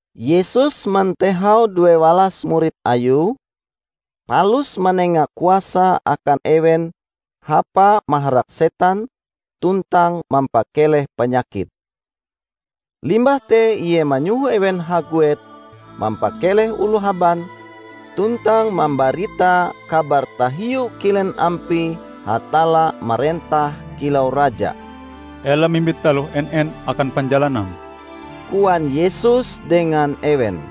Yesus mantehau duewalas murid Ayue, palus manenga kuasa akan ewen hapa maharak setan tuntang mampakeleh panyakit. Limbah te Ie manyoho ewen haguet mampakeleh oloh haban tuntang mambarita kabar tahiu kilen ampie Hatalla marentah kilau Raja. "Ela mimbit taloh en-en akan panjalanam," koan Yesus dengan ewen.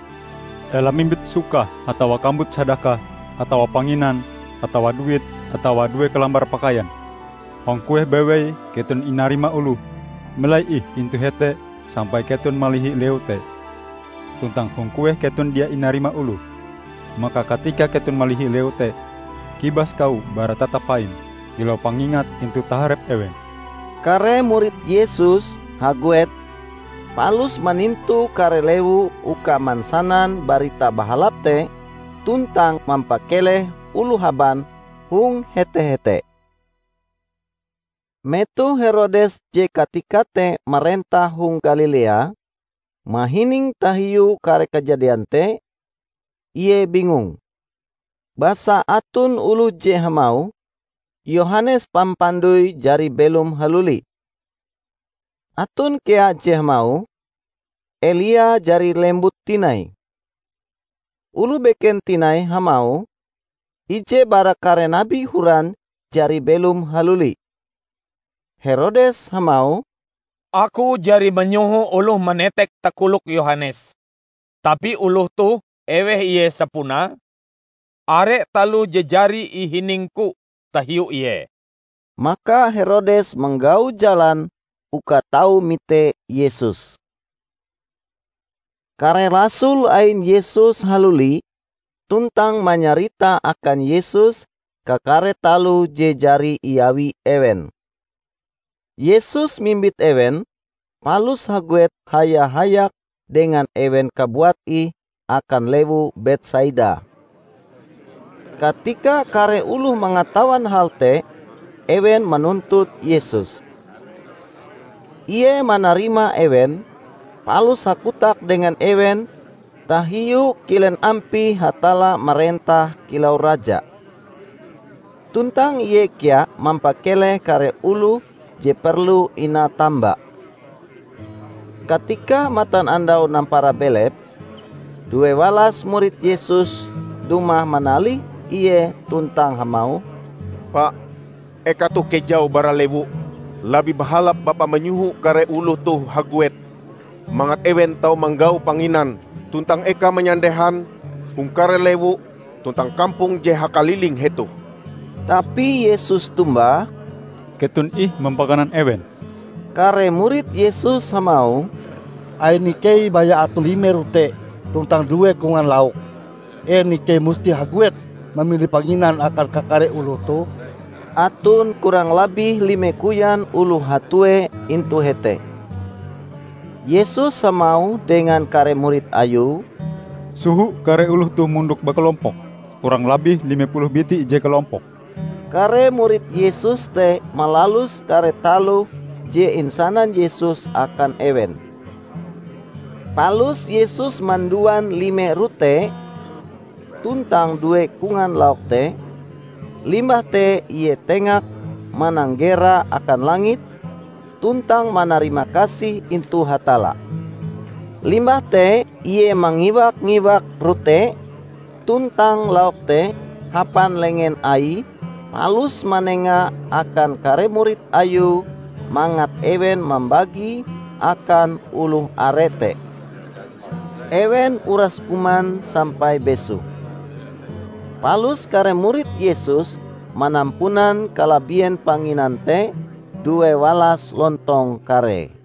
"Ela mimbit sukah atawa kambut sadakah, atawa panginan, atawa duit, atawa due kalambar pakaian. Hong kueh bewei keton inarima oloh, melai ih intu hete sampai keton malihi lewu te. Tuntang hong kueh keton dia inarima oloh, maka katika keton malihi lewu te, kibas kawo bara tatap paim, kilau pangingat intu taharep ewen." Kare murid Yesus haguet, palus manintu kare lewu uka mansanan Barita Bahalap te tuntang mampakeleh oloh haban hong hete-hete. Metoh Herodes je katika te marentah hong Galilea, mahining tahiu kare kajadian te, ie bingung. Basa aton oloh je hamauh, Yohanes Pampandoi jari belom haluli. Aton kea je hamauh, Elia jari lembut tinai. Oloh beken tinai hamauh, ije bara kare nabi horan jari belom haluli. Herodes hamauh, "Aku jari manyoho oloh manetek takolok Yohanes. Tapi oloh toh, eweh Ie sapunae? Are taloh je jari ihiningku tahiu Ie." Maka Herodes manggau jalan uka tau mite Yesus. Kare rasul ain Yesus haluli tuntang manyarita akan Yesus kakare taloh je jari iawi ewen. Yesus mimbit ewen, palus haguet haya-hayak dengan ewen kabuat ih akan lewu Betsaida. Katika kare oloh mangatawan hal te, ewen manuntut Yesus. Ie manarima ewen, palus hakotak dengan ewen tahiu kilen ampie Hatalla marentah kilau Raja. Tuntang Ie kea mampakeleh kare oloh je perlu inatamba. Katika matanandau nampara belep, duewalas murid Yesus dumah manalih Ie tuntang hamauh, "Pa, eka toh kejau bara lewu. Labih bahalap Bapa manyoho kare oloh toh haguet, mangat ewen tau manggau panginan tuntang eka manyandehan hong kare lewu tuntang kampong je hakaliling hetoh." Tapi Yesus tombah, "Keton ih mampakanan ewen." Kare murid Yesus hamauh, "Ain ikei baya aton lime rote tuntang due kongan lauk. En ikei musti haguet mamili panginan akan kakare oloh toh?" (Aton kurang labih lime koyan oloh hatue intu hete.) Yesus hamauh dengan kare murid Ayue, "Soho kare oloh toh mondok bakalompok, kurang labih lime puluh biti ije kalompok." Kare murid Yesus te malalus kare taloh je insanan Yesus akan ewen. Palus Yesus manduan lime rote tuntang due kongan lauk te, limbah te Ie tengak mananggera akan langit tuntang manarimakasih intu Hatalla. Limbah te Ie mangiwak-mangiwak rote tuntang lauk te hapan lengen Aie palus manenga akan kare murid Ayue mangat ewen mambagie akan oloh are te. Ewen uras kuman sampai besoh. Palus kare murid Yesus manampunan kalabien panginan te duewalas lontong karee.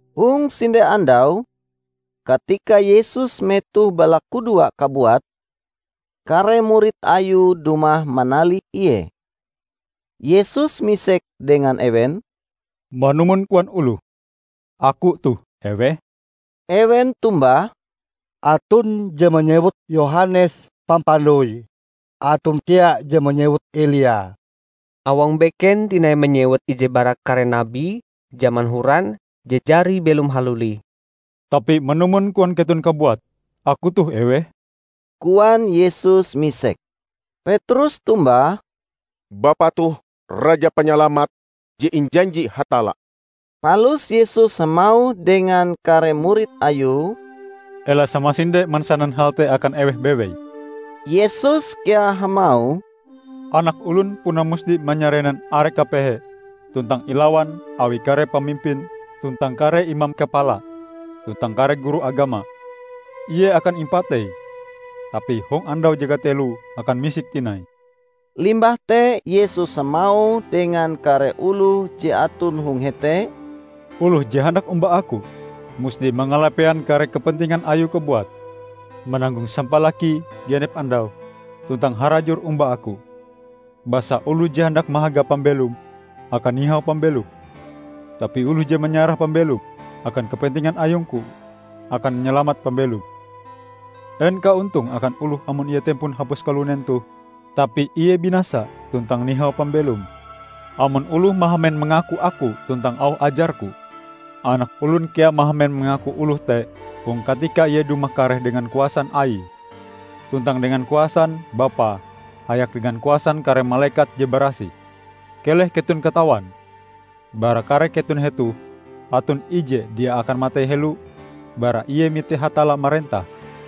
Hong sinde andau, katika Yesus metoh balakudoa kabuat, kare murid Ayue dumah manalih Ie. Yesus misek dengan ewen, "Manumon koan oloh, Aku toh eweh?" Ewen tombah, "Aton je manyewut Yohanes Pampandoi. Aton kea je manyewut Elia, awang beken tinai manyewut ije bara kare nabi jaman horan je jari belom haluli." "Tapi manumon koan keton kabuat, Aku toh eweh?" koan Yesus misek. Petrus tombah, "Bapa toh Raja Panyalamat je injanji Hatalla." Palus Yesus hamauh dengan kare murid Ayue, "Ela samasinde mansanan hal te akan eweh bewei." Yesus kea hamauh, "Anak Olon puna musti manyarenan are kapehe tuntang ilawan awi kare pamimpin tuntang kare imam kapala, tuntang kare guru agama. Ie akan impatei, tapi hong andau je kateloe akan misik tinai." Limbah te Yesus hamauh dengan kare oloh je aton hong hete, "Oloh je handak omba Aku, musti mangalapean kare kepentingan ayue kabuat, mananggong sampalakie genep andau, tuntang harajur omba Aku. Basa oloh je handak mahaga pambelome, akan nihau pambelome. Tapi oloh je manyarah pambelome akan kepentingan ayung-Ku, akan manyalamat pambelome. En kaontonge akan oloh amon ie tempon hapus kalunen toh tapi ie binasa tuntang nihau pambelome? Amon oloh mahamen mangaku Aku tuntang auh ajar-Ku, Anak Olon kea mahamen mangaku oloh te hong katika ie dumah kareh dengan kuasan Aie, tuntang dengan kuasan Bapa hayak dengan kuasan kare malekat je barasih! Keleh keton katawan: bara kare keton hetoh aton ije dia akan matei helo bara ie mite Hatalla marentah."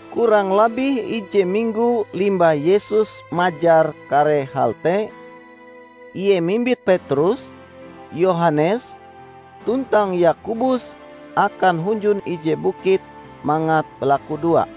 Kurang labih ije minggo limbah Yesus majar kare hal te, Ie mimbit Petrus, Yohanes, tuntang Yakobus akan hunjun ije bukit mangat balakudoa.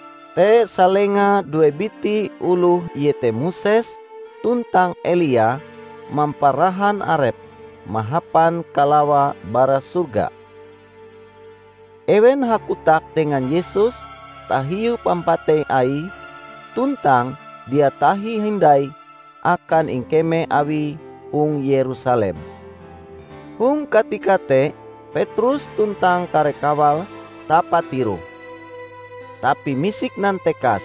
Te salenga due biti oloh iete Moses tuntang Elia mamparahan arepe mahapan kalawa bara sorga. Ewen hakotak dengan Yesus tahiu pampatei Aie tuntang dia tahi hindai akan ingkeme Awie hong Yerusalem. Hong katika te Petrus tuntang kare kawale tapatiroh, tapi misik nantekas,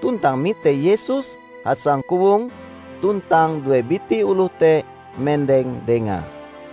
tuntang mite Yesus hasangkowong tuntang due biti oloh te mendeng Dengae.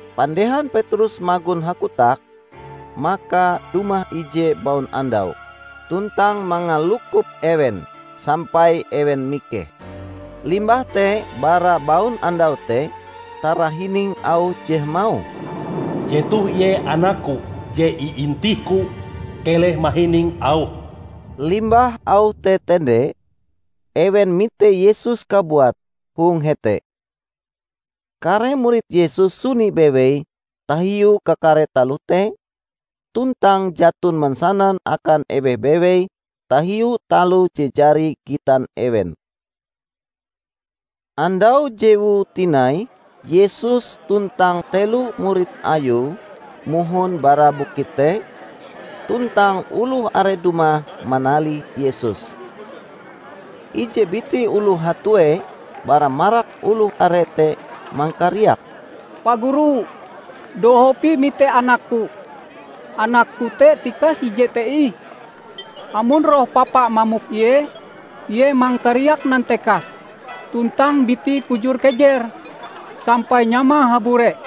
Pandehan Petrus magon hakotak, maka dumah ije baunandau, tuntang mangalukop ewen, sampai ewen mikeh. Limbah te bara baunandau te tarahining auh je hamauh, "Jetoh Ie Anak-Ku je iintih-Ku. Keleh mahining Auhe!" Limbah auh te tende, ewen mite Yesus kabuate hong hete. Kare murid Yesus suni bewei tahiu kakare taloh te, tuntang jaton mansanan akan eweh bewei tahiu taloh je jari gitan ewen. Andau jewue tinai Yesus tuntang telo murid Ayue mohon bara bukit te, tuntang oloh are dumah manalih Yesus. Ije biti oloh hatue bara marak oloh are te mangkariak, "Pa Guru, dohop ih mite anakku -- anakku te tikas ije te ih! Amon roh papa mamok ie, ie mangkariak nantekas tuntang bitie kujur-kejer sampai nyamae habure.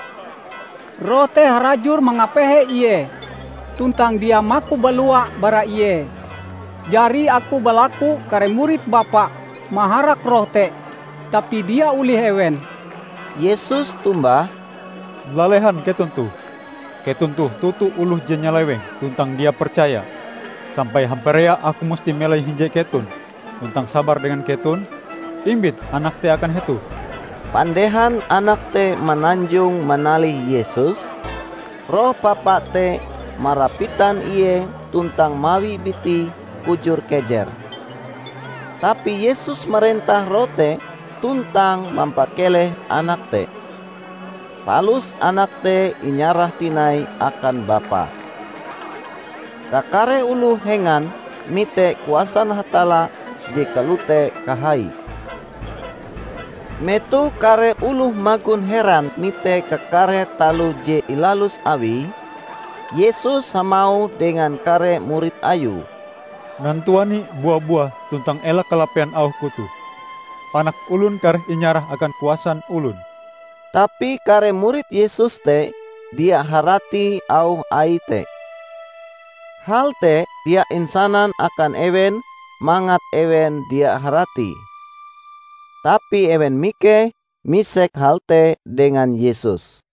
Roh te harajur mangapehe ie tuntang dia maku balua bara ie! Jari aku balaku kare murid Bapa maharak roh te, tapi dia olih ewen." Yesus tombah, "Lalehan keton toh! Keton toh toto oloh je nyaleweng tuntang dia percaya! Sampai hamparea Aku musti melai hinje keton tuntang sabar dengan keton? Imbit anak te akan hetoh!" Pandehan anak te mananjong manalih Yesus, roh papa te marapitan ie tuntang mawi bitie kujur-kejer. Tapi Yesus marentah roh te tuntang mampakeleh anak te. Palus anak te inyarah tinai akan bapae. Kakare oloh hengan mite kuasan Hatalla je kalote kahaie. Metoh kare oloh magon heran mite kakare taloh je ilalus Awie, Yesus hamauh dengan kare murid Ayue, "Nantuani bua-buah tuntang ela kalapean auh-Ku toh: Anak Olon kareh inyarah akan kuasan olon." Tapi kare murid Yesus te dia harati auh Aie te. Hal te dia insanan akan ewen mangat ewen dia haratie. Tapi ewen mikeh misek hal te dengan Yesus.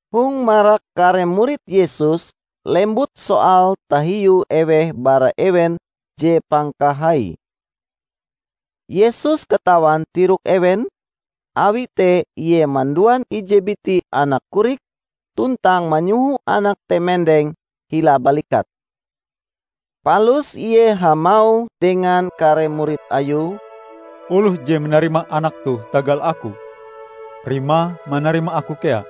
Hong marak kare murid Yesus lembut soal tahiu eweh bara ewen je pangkahaie. Yesus katawan tirok ewen, awi te Ie manduan ije biti anak korik tuntang manyoho anak te mendeng hila balikate. Palus Ie hamauh dengan kare murid Ayue, "Oloh je manarima anak toh tagal Aku, rimae manarima Aku kea.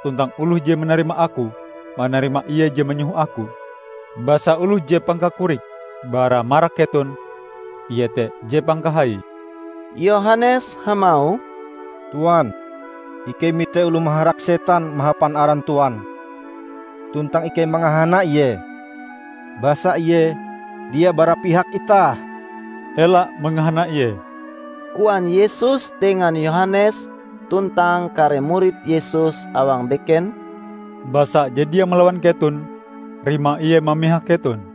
Tuntang oloh je manarima Aku, manarima Ie je manyoho Aku. Basa oloh je pangkakorike bara marak keton, ie te je pangkahaie!" Yohanes hamauh, "Tuan, ikei mite oloh maharak setan mahapan aran Tuan, tuntang ikei mangahana ie, basa ie dia bara pihak itah." "Ela mangahana ie," koan Yesus dengan Yohanes tuntang kare murid Yesus awang beken, "basa je dia malawan keton, rimae ie mamihak keton."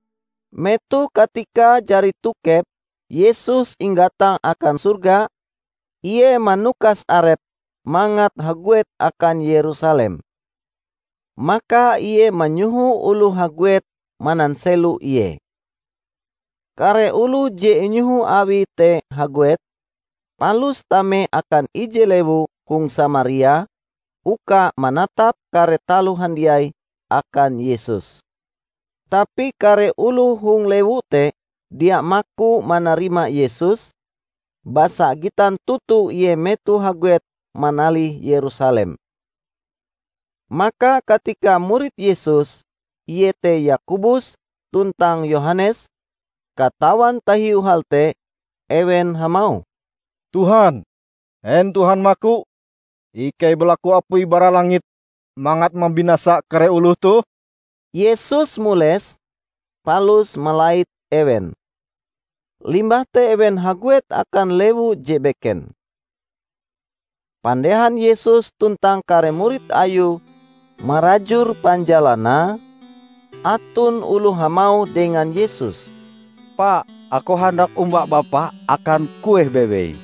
Metoh katikae jari tokep Yesus inggatang akan sorga, Ie manukas arepe mangat haguet akan Yerusalem. Maka Ie manyoho oloh haguet mananselo Ie. Kare oloh je inyoho Awie te haguet, palus tame akan ije lewu hong Samaria uka manatap kare taloh handiai akan Yesus. Tapi kare oloh hong lewu te dia maku manarima Yesus, basa gitan toto Ie metohe haguet manalih Yerusalem. Maka katika murid Yesus, iete Yakobus tuntang Yohanes, katawan tahiu hal te, ewen hamauh, "Tuhan, en Tuhan maku, ikei balaku apui bara langit mangat mambinasa kare oloh toh?" Yesus mules, palus malait ewen. Limbah te ewen haguet akan lewu je beken. Pandehan Yesus tuntang kare murid Ayue marajur panjalanan, aton oloh hamauh dengan Yesus, "Pa, aku handak omba Bapa akan kueh bewei!"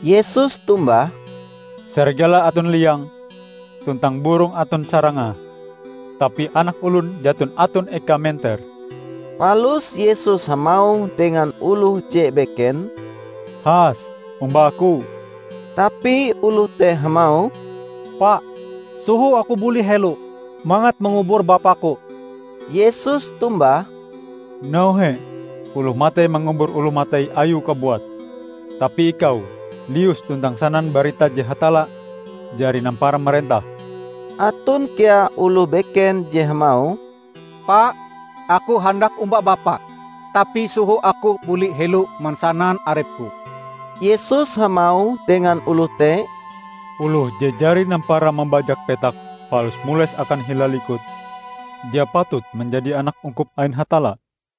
Yesus tombah, "Sarigala aton liange, tuntang burong aton sarangae, tapi Anak Olon jaton aton ekae menter." Palus Yesus hamauh dengan oloh je beken, "Has, omba Aku." Tapi oloh te hamauh, "Pa, soho Aku buli helo mangat mangubur bapaku." Yesus tombah, "Nauhe oloh matei mangubur oloh matei ayue kabuat. Tapi ikau, lius, tuntang sanan barita je Hatalla jari nampara marentah." Aton kea oloh beken je hamauh, "Pa, aku handak omba Bapa, tapi soho aku buli helo mansanan arepku." Yesus hamauh dengan oloh te, "Oloh je jari nampara mambajak petak palus mules akan hila likut, dia patut manjadi anak ungkup ain Hatalla."